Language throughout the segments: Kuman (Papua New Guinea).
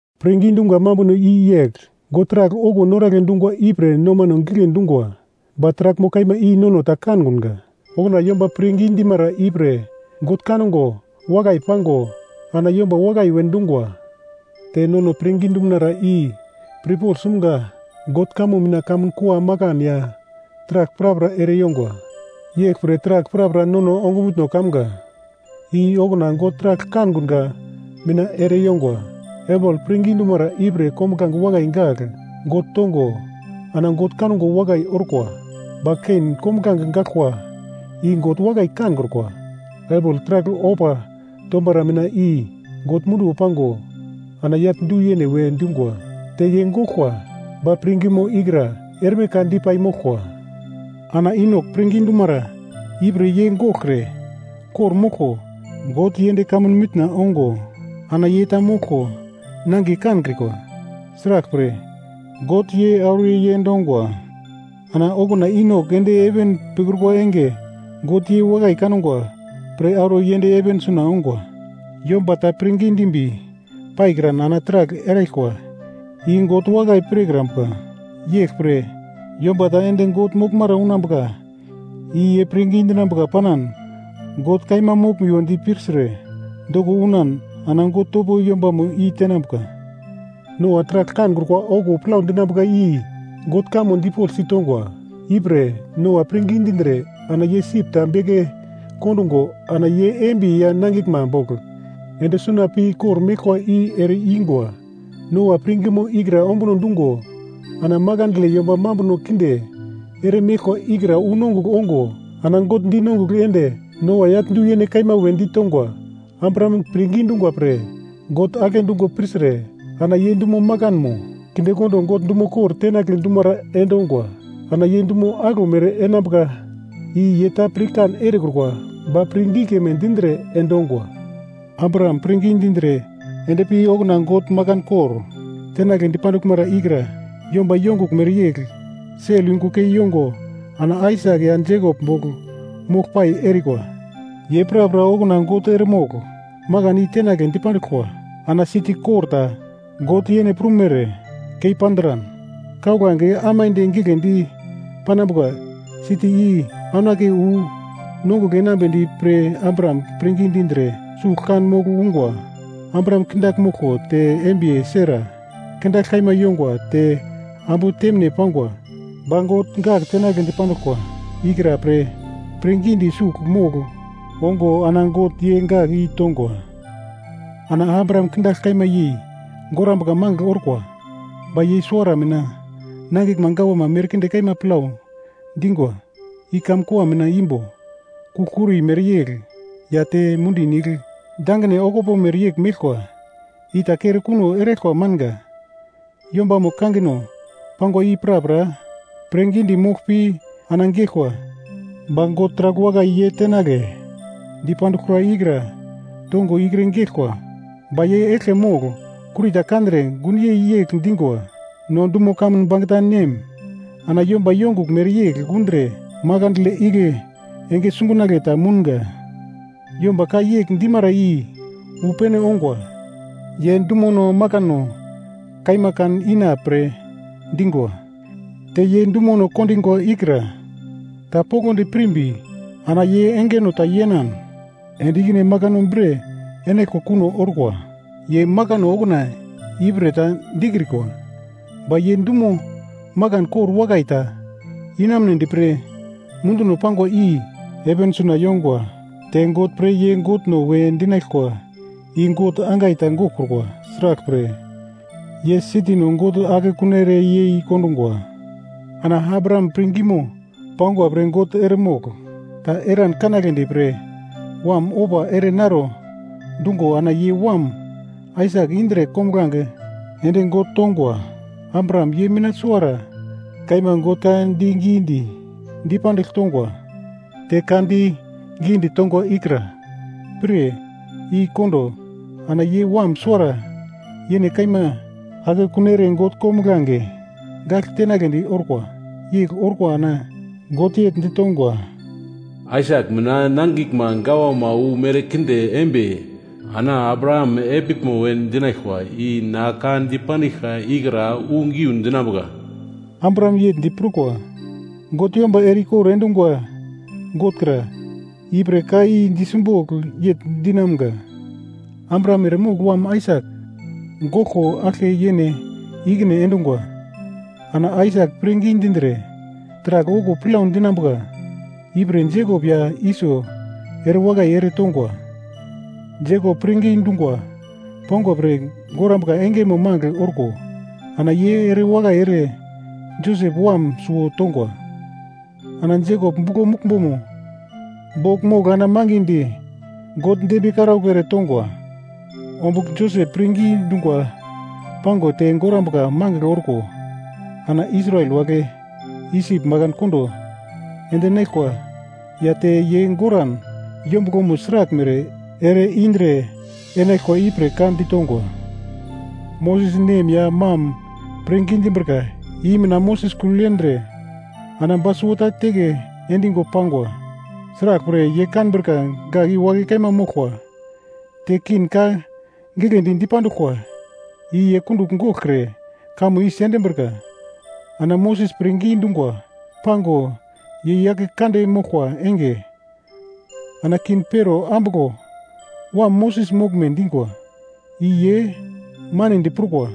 Pirngi dumga mambuno i yegl: God taragl okuwo noragle dungwa ipre nomano gigle dungwa, ba taraglmo kaima i nono ta kankunga. Okuna yomba pirngi dimara ipre God kango wakai pago ana yomba wakai we dungwa. Te nono pirngi dumunara i pirpogl sumga God kamo mina kamun kua makan ya taragl prapra ere yongwa. Yeglpre taragl prapra nono ongumutno kamga i okuna God taragl kankunga mina ere yongwa. Abel pirngi dumara ipre kombuglange wakai gagl God tongo ana God kango wakai orkwa, ba Kein kombuglange gaglkwa i God wakai kankrukwa. Abel taragl ofa tomara mina i God munduwo pango ana yagl du-yene we dungwa. Te ye goglkwa, ba pirngimo ikra erme ka dipai moglkwa. Ana Inok pirngi dumara ipre ye goglkre kor-moglko God yend kamun mitna ongo ana ye ta moglko nangiye kankrikwa, sraglpre, God ye auro yend ongwa. Ana okuna Inok ende heven pikrukwa enge, God ye wakai kangwa pre auro yend heven suna ongwa. Yomba ta pirngi dimbi paikran ana taragl eraglkwa i God wakai pirkrambuka, yeglpre yomba ta ende God moglmara unambuka i ye pirngi dinambuka panan God kaima moglumiwo di pirtre doko unan ana God topo yombamo i-tenambuka. Noa taragl kankrukwa okuwo plau dinambuka i God kamo dipoglsi tongwa, ipre Noa pirngi dindre ana ye sip ta beke kondungo ana ye embiye ya nangiglma bogl ende suna pi kor-meglkwa i ere ingwa. Noa pirngimo ikra ombuno dungo ana makandle yomba mambuno kinde ere meglkwa ikra unongugl ongo ana God dinongugl ende Noa yagl du-yene kaima we ditongwa. Abraham pirngi dungwa pre God agle dungo pirtre ana ye dumo makanmo kindekondo God dumo kor tenagle dumara endongwa. Ana ye dumo aglomere enambuka i ye ta pirkan erekrukwa ba pirngi keme dindre endongwa. Abraham pirngi dindre endpi okuna God makan kor tenagle dipanduglmara ikra yomba yongugl mereyegl sel yungu kei yongo ana Aisak ya Jekop bogl mogl pai erikwa. Ye prapra okuna God eremogl makan i tenagle dipanduglkwa. Ana siti kor ta God yene prumere keipandran kauglange aimande giglendi panambuka siti i aunake wu nongugl enambedi pre Abraham pirngi dindre sugl kan mogl ungwa. Abraham kindagl moglko te embiye Sara kindagl kaima yongwa te ambu temine pangwa, ba God gak tenagle dipanduglkwa ikra pre pirngidi sugl mogl ongo ana God ye gak i tongwa. Ana Abraham kindagl kaima yei gorambuka magl orkwa, ba ye suwara mina nangiglma gawama merkinde kaima plau dingwa, i kamkua mina imbo kugl-kuri mereyegl ya te mundi nigl dangine okupo mereyegl meglkwa, i ta kere kuno eraglkwa manga. Yombamo kangino pangwa i prapra pirngidi mogl pi ana geglkwa, ba God taragl wakai ye tenagle dipanduglkra ikra tongo ikre geglkwa. Ba ye eglke mogl kuri ta kandre gunyei yegl dingwa, “No dumo kamun bangeta nem ana yomba yongugl mereyegl undre makandle igle enge sungunagle ta mounga.” Yomba ka yegl dimara i wu pene ongwa ye dumuno makano kaima kan ina pre dingwa. Te ye dumuno kondingwa ikra ta poglodi pirmbi ana ye engeno ta yenan ende ikine makano bre enaglkwa kuno orkwa. Ye makano okuna ipre ta dikrikwa, ba ye dumo makan kor wakai ta inamunedi pre munduno pangwa i heven suna yongwa. Te God pre ye Godno we dinaglkwa i God angai ta goglkrukwa, sraglpre, ye sitino God akekun ere yei kondungwa. Ana Abraham pirngimo pangwa pre God eremogl ta eran kanagledi pre wam ofa ere naro dungo ana ye wam Aisak indre kombuglange ende God tongwa. Abraham ye mina suwara kaima God ka digidi dipandigl tongwa, te ka di gidi tongwa ikra pir i-kondo ana ye wam suwara yene kaima akekun ere God kombuglange gagl tenagledi orkwa, yegl orko ana God yegl ditongwa, “Aisak mina nangiglma gawama wu merkinde embi ana Abraham epiglmo we dinaglkwa i na ka dipandiglka ikra wu geu dinambuka.” Abraham yegl di prukwa, God yomba ere-ikor endungwa God kra, ipre ka i di simbogl yegl dinamga, Abraham eremogl wam Aisak goglko aglke yene ikine endungwa. Ana Aisak pirngi dindre taragl okuwo plau dinambuka ipre Jekop ya Iso ere wakai ere tongwa. Jekop pirngi dungwa pangwa pre gorambuka engemo magl orko ana ye ere wakai ere Josep wam suwo tongwa. Ana Jekop buglo muglmbomo bogl mogl ana mangidi God dembiye karaugl ere tongwa. Ombugl Josep pirngi dungwa pango te gorambuka magl orko ana Israel wagle Isip makan kondo endinaglkwa ya te ye goran yombuglomo sraglmere ere indre enaglkwa ipre ka ditongwa. Moses nem ya mam pirngi dimbrika i mina Moses kugl yendre ana ba suwota teke endingo pangwa, sraglpre ye kanbrika gak i wakai kaima moglkwa. Te king ka giglendi dipanduglkwa i ye kundugl goglkre kamo i sendimbrika. Ana Moses pirngi dungwa pango ye yake kande moglkwa enge, ana king Pero ambuglo wam Moses moglme dingwa i ye manedi prukwa.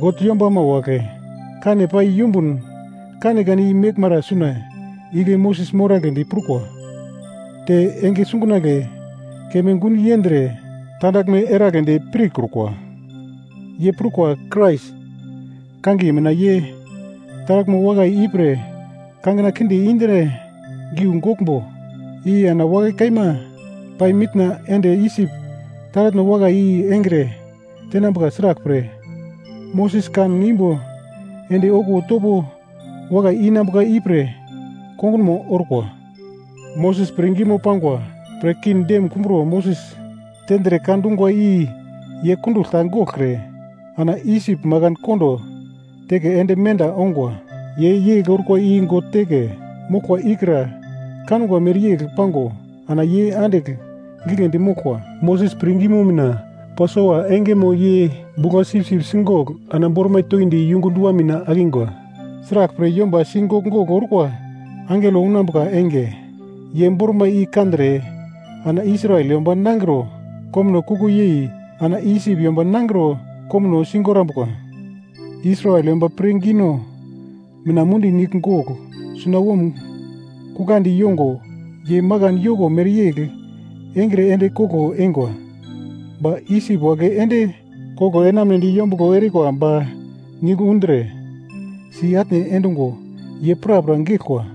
God yombama wagle kane pai yumbun kanekane i meglmara suna igle Moses moragledi prukwa, te enge sungunagle keme gun yendre tandaglme eragledi pirkrukwa. Ye prukwa Krais kangiye mina ye taraglmo wakai i pre kangina kinde indre giu goglmbo, i ana wakai kaima pai mitna ende Isip taratno wakai i engre tenambuka, sraglpre, Moses kan imbo ende okuwo topo wakai inambuka ipre kongunmo orkwa. Moses pirngimo pangwa pre king dem kumbro Moses tendre ka dungwa i ye kundugl ta goglkre ana Isip makan kondo teke ende menda ongwa, ye yegl orkwa i God teke moglkwa ikra kangwa mereyegl pango ana ye andigl giglendi moglkwa. Moses pirngimo mina Pasova engemo ye bugla-sipsip sigogl ana bormai toindi yungu dua mina akingwa, sraglpre yomba sigogl-gogl orkwa angelo unambuka enge ye bormai i kandre ana Israel yomba nangro komuno kuko yei ana Isip yomba nangro komuno sigorambuka. Israel yomba pirngino mina Mundi Nigl Gogl sunawom kuglandi yongo ye makan yoko mereyegl engre ende koglo eingwa, ba Isip wagle ende koglo enamunedi yombuglo erikwa ba nigl undre si-atne endungo ye prapra geglkwa.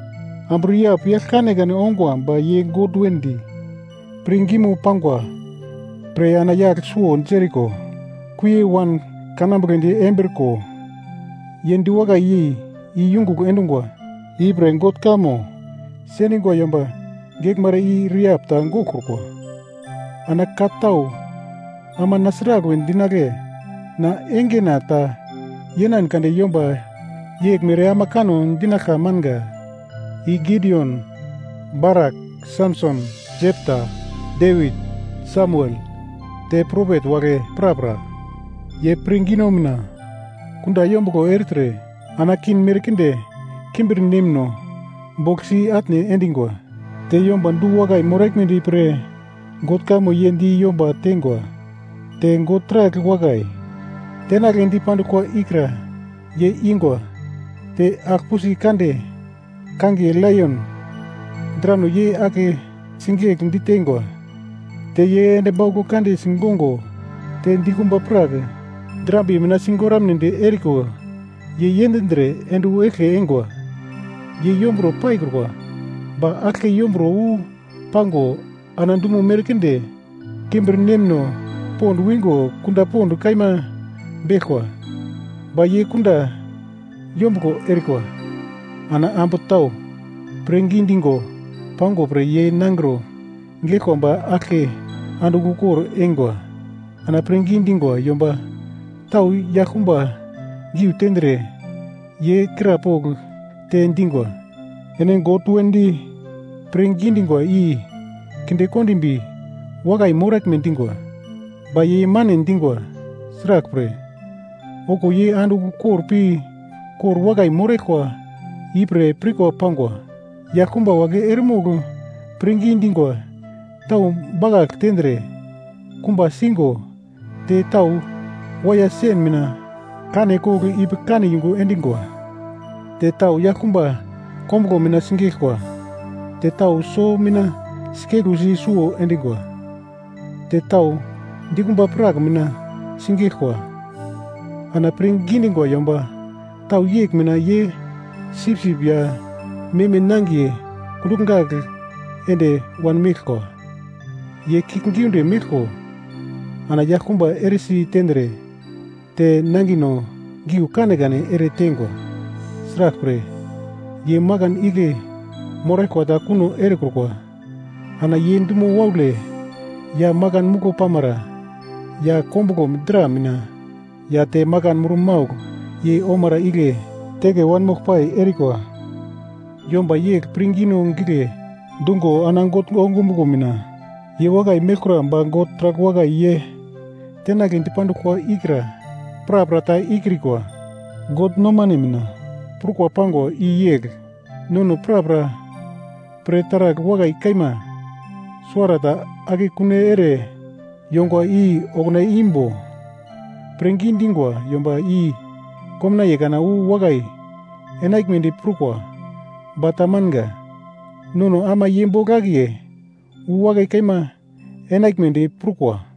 Ambu Rehap yagl kanekane ongwa ba ye God wedi pirngimo pangwa pre ana yagl suwo Jeriko kuie wan kanambugledi embriko ye diwakai yei i yungugl endungwa. Ipre God kamo sendingwa yomba geglmara i Rehap ta goglkrukwa. Ana ka tau ama na sragl we dinagle? Na engena ta yenan kande yomba yeglmere ama kanno dinaglka manga: I Gidion, Barak, Samson, Jepta, Devit, Samuel, te propet wagle prapra; ye pirngino mina kunda yombuglo ertre ana king merkinde kimbirnemno bogl si-atne endingwa. Te yomba du-wakai moraglmedi pre God kamo ye di yomba teingwa, te God taragl wakai tenagle dipanduglkwa ikra ye ingwa, te agl-pusi kande kangiye laion drano ye ake sigegl diteingwa, te ye endi bauglo kande sigongo, te dikumba prak drambiye mina sigoramnedi eriko ye yendindre ende wu eglke eingwa. Ye yombro paikrukwa ba aglke yombro wu pango ana dumo merkinde kimbirnemno pond wingo kunda pond kaima beglkwa, ba ye kunda yombuglo erikwa. Ana ambu tau pirngi digo pangwa pre ye nangro geglkwa ba aglke andigl ukor eingwa. Ana pirngi dingwa yomba tau yaglkumba giu tendre ye krapogl te dingwa, ene God wedi pirngi dingwa i kinde kondimbi wakai moraglme dingwa, ba ye mane dingwa, sraglpre, okuwo ye andigl ukor pi kor wakai moraglkwa ipre pirkwa pangwa. Yaglkumba wagle eremogl pirngi dingwa tau bakagl tendre, kumba sigo te tau waiya sen mina kane kogl ipi kane yungu endingwa, te tau yaglkumba kombuglo mina sigeglkwa, te tau so mina sikeglusi suwo endingwa, te tau dikumba prak mina sigeglkwa. Ana pirngi dingwa yomba tau yegl mina ye sipsip ya meme nangiye kungugl gagl ende wanmeglkwa, ye kiuglgiunde meglko ana yaglkumba eresi tendre te nangino giu kanekane ere teingwa. Sraglpre, ye makan igle moraglkwa ta kuno erekrukwa. Ana ye dumo waule ya makan muglo pamara ya kombuglo dra mina ya te makan murmaugl yei omara igle teke wanmogl pai erikwa. Yomba yegl pirngino gigle dungo ana God ongumuglo mina ye wakai meglkura, ba God taragl wakai ye tenagle dipanduglkwa ikra prapra ta ikrikwa. God nomane mina prukwa pangwa i yegl, nono prapra pre taragl wakai kaima, suwara ta akekun ere yongwa i okuna imbo pirngi dingwa yomba i komnaiye kana wu wakai enaglmedi pirkwa ba ta manga. Nono ama ye bogl akiye wu wakai kaima enaglmedi prukwa.